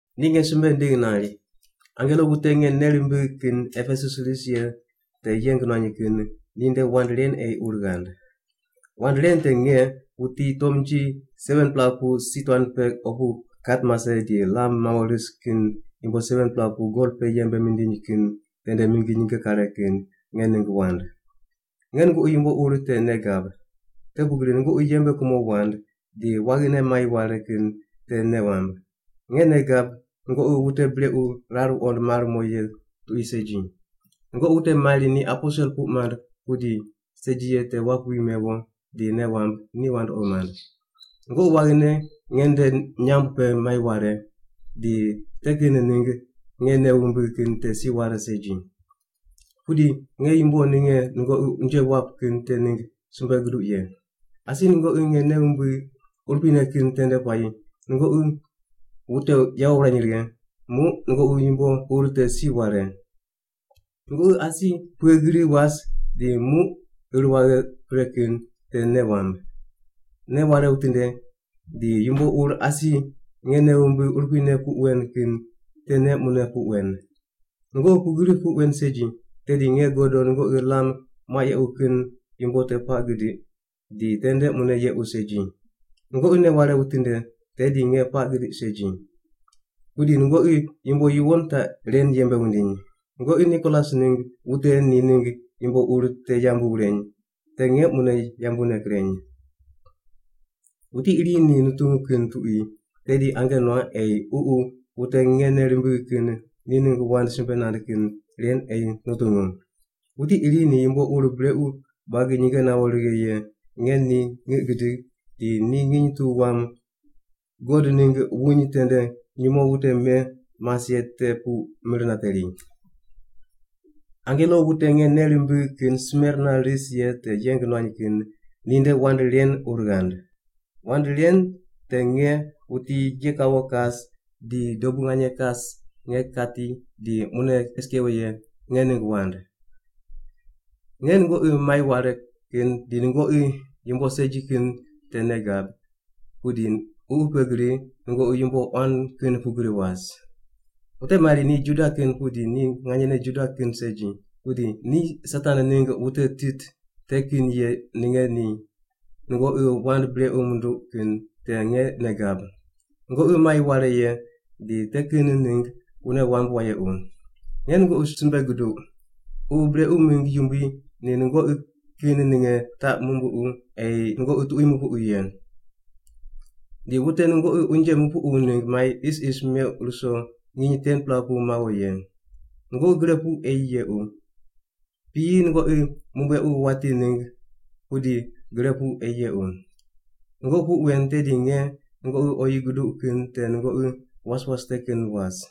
Ni nge simbe nindigh nari, “Angelo wute nge nei rimbigh kin Epesus ris ye te yeng nuany kin ninde wand ren ei ur ghand: Wand ren te nge, wuti tomnji 7-pela pu si tuan pe opu kat mase di lam mawo ris kin yumbo 7-pela pu gol pe yembe mindiny kin tende mingi nyinge kare kin, nge ningg wand. Nge nungoqi yumbo ur te nei gab. Te pugri nungoqi yembe kumo wand, di waghine mai ware kin te nei wamb. Nge nei gab nungoqi wute brequ rar wuqond mar mo ye tuqui segi. Nungoqi wute mari ni aposel puq mand pudi segi ye te wap wi mewo di nei wamb ni wandoqi mand. Nungoqi waghine nge nde nyamb pe mai ware, di te kin ningg nge nei wumbigh kin te si ware segi. “Pudi nge yumbo ninge nungoqi unje wap kin te ningg simbe guduq ye. Asi nungoqi nge nei wumbigh urupuine kin tende puayi nungoqi wute yawo wurany righe, muq nungoqi yumbo ur te si ware. Nungoqi asi pughe gri was di muq ir waghe pre kin te nei wamb. Nei ware witinde di yumbo ur asi nge nei wumbigh urupuine puq wen kin tene mune puq wen. Nungoqi pugri puq wen segi, tedi nge godo nungoqi lam muaq yequ kin yumbo te puaq gidiq di tende mune yequ segi. Nungoqi nei ware witinde tedi nge puaq gidiq segi. Pudi nungoqi yumbo yuwon taq ren yembe wundiny: Nungoqi Nikolas ningg wute ni mingg yumbo ur te yambu wureny, te nge mune yambune kireny. “Wuti iri ni nutungu kin tuqui tedi ange nuaq ei Ququ wute nge nei rimbigh kin ni ningg wand simbe nand kin ren ei nutungu. Wuti iri ni yumbo ur brequ buagi nyinge nawo righe ye nge ni ngiq gidig di ni nginy tu wam God ningg wuny tende nyumo wute me mas ye tende pu mir nateri.” “Angelo wute nge nei rimbigh kin Smerna ris ye te yeng nuany kin ninde wand ren ur ghand: Wand ren te nge, wuti ye kawo kas di dobu nganye kas nge kati di mune kes kewo ye, nge ningg wand. Nge nungoqi mai ware kin di nungoqi yumbo segi kin te nei gab, pudi ququ pe gri nungoqi yumbo quan kin pugri was. Wute mari ni Juda kin pudi ni nganyene Juda kin segi, pudi ni Satan ningg wute tit te kin ye ninge ni nungoqi wand brequ munduq kin te nge nei gab. Nungoqi mai ware ye di te kin ningg wune wamb wayequ. Nge nungoqi simbe guduq, ququ brequ mingg yumbui ni nungoqi kin ninge taq numbuqu ei nungoqi tuqui nupuqu ye. Di wute nungoqi unje mupuqu ningg mai isis meuq ruso nginy 10-pela pu wawo ye. Nungoqi gre pu ei yequ, piyi nungoqi mumbuequ wati ningg pudi gre pu ei yequ. Nungoqi puq wen tedi nge nungoqi oyi guduq kin te nungoqi was was te kin was.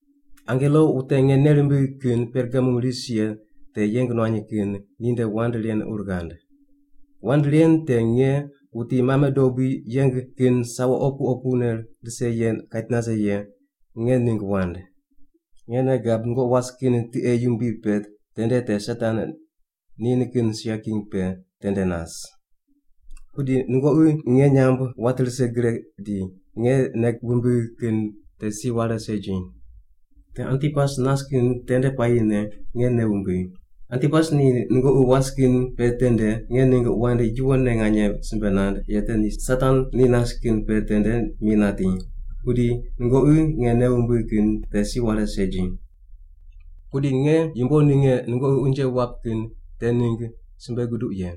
“Angelo wute nge nei rimbigh kin Pergamum ris ye te yeng nuany kin ninde wand ren ur ghand: Wand ren te nge, wuti mame dobui yeng kin sawo opu opune rise ye kait nase ye, nge ningg wand. Nge nei gab nungoqi was kin tiqe yumbui pe tende te Satan ni nikin sia king pe tende nas. Pudi nungoqi nge nyamb wat rise gre di nge nei wumbigh kin te si ware segi. Te Antipas nas kin tende puayine nge nei wumbigh. Antipas ni nungoqi was kin pe tende nge ningg wand yuwonne nganye simbe nand ye ni Satan ni nas kin pe tende mi nati, pudi nungoqi nge nei wumbigh kin te si ware segi. “Pudi nge yumbo ninge nungoqi unje wap kin te ningg simbe guduq ye: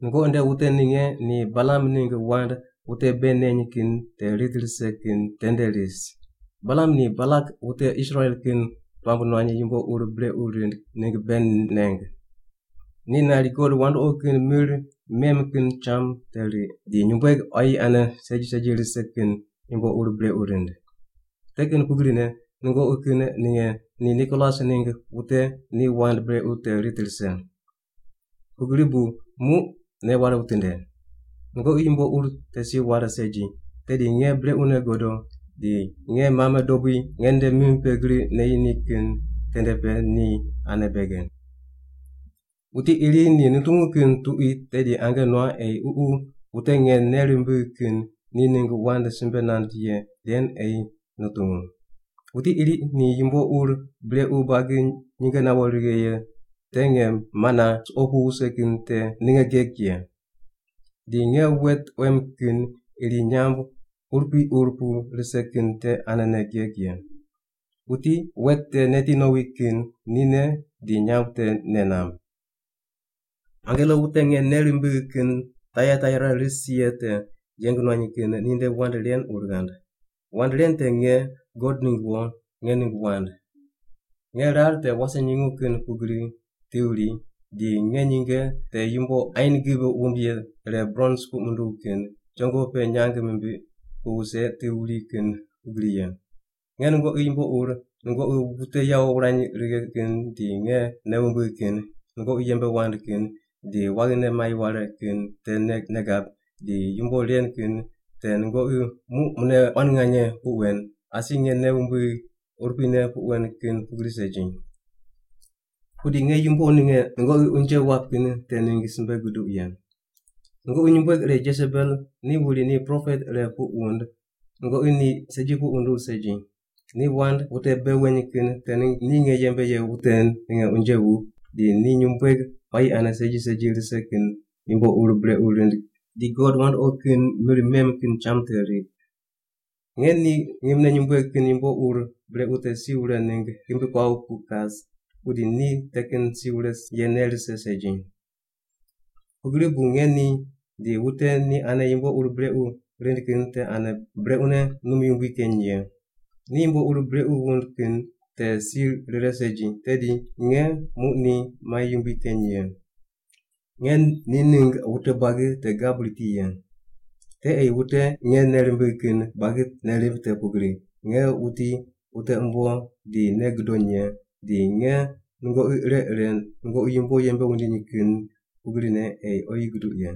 Nungoqi nde wute ninge ni Balam ningg wand wute bei neny kin te rit rise kin tende ris. Balam ni Balak wute Israel kin puamb nuany yumbo ur brequ rind ningg bei neng. Ni nari god wandoqi kin mir mem kin cham te riq, di nyumbueg quayi ane segi segi rise kin yumbo ur brequ rind. Te kin pugrine nungoqi kin ninge ni Nikolas ningg wute ni wand brequ te rit rise. Pugri bu muq nei ware witinde! Nungoqi yumbo ur te si ware segi, tedi nge brequne godo di nge mame dobui nge nde mim pe gri neyi ni kin tende pe ni ane bege. “Wuti iri ni nutungu kin tuqui tedi ange nuaq ei Ququ wute nge nei rimbigh kin ni ningg wand simbe nand ye ren ei nutungu. Wuti iri ni yumbo ur brequ buagi nyinge nawo righe ye te nge mana suqo pu wuse kin te ninge geg ye. Di nge wet quem kin iri nyamb urupui ur pu rise kin te anene geg ye. Wuti wet te neti nowi kin nine di nyamb te nei namb.” “Angelo wute nge nei rimbigh kin Taiataira ris ye te yeng nuany kin ninde wand ren ur ghand: Wand ren te nge, God ningg wo, nge ningg wand. Nge rar te wase nyungu kin pugri ti wuri, di nge nyinge te yumbo ain gib wumb ye ire brons puq munduw kin chongo pe nyang mimbiq pu wuse ti wuri kin pugri ye. Nge nungoqi yumbo ur, nungoqi wute yawo wurany righe kin di nge nei wumbigh kin, nungoqi yembe wand kin di waghine mai ware kin te nge nei gab, di yumbo ren kin te nungoqi muq mune quan nganye puq wen, asi nge nei wumbigh urupuine puq wen kin pugri segi. “Pudi nge yumbo ninge nungoqi unje wap kin te ningg simbe guduq ye. Nungoqi nyumbueg ire Jesebel ni wuri ni propet ire puq wund nungoqi ni segi puq wunduw segi. Ni wand wute bei weny kin te ningg ni nge yembe ye wute ninge unje wup di ni nyumbueg quayi ane segi segi rise kin yumbo ur brequ rind di god wandoqi kin mir mem kin cham te riq. Nge ni ngimne nyumbueg kin yumbo ur brequ te si wure ningg ghimbi kuaw pu kas, pudi ni te kin si wure ye nei rise segi. Pugri bu nge ni di wute ni ane yumbo ur brequ rind kin te ane brequne num yumbui keny ye. Ni yumbo ur brequ wund kin te si rire segi, tedi nge muq ni mai yumbui keny ye. Nge ni ningg wute buagi te gab riti ye. Te ei wute nge nei rimbigh kin buagi nei rimb te pugri nge wuti wute umbo di nei gudony ye, di nge nungoqi ire ire nungoqi yumbo yembe wundiny kin pugrine ei oyi guduq ye.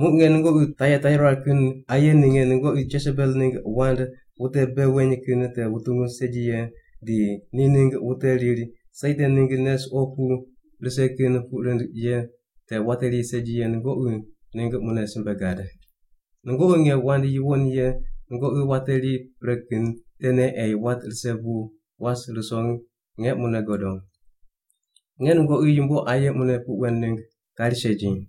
Muq nge nungoqi Taiataira kin aye ninge nungoqi Jesebel ningg wand wute bei weny kin te wutungu segi ye di ni ningg wute riri Satan ningg nei suqo pu rise kin puq rind ye te wateri segi ye nungoqi ningg mune simbe gad. Nungoqi nge wand yuwon ye nungoqi wateri pre kin tene ei wat rise pu was ruso nge mune godo. Nge nungoqi yumbo aye mune puq wen ningg kari segi.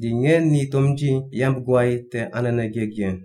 Di nge ni tomnji yamb guay te anene geg ye.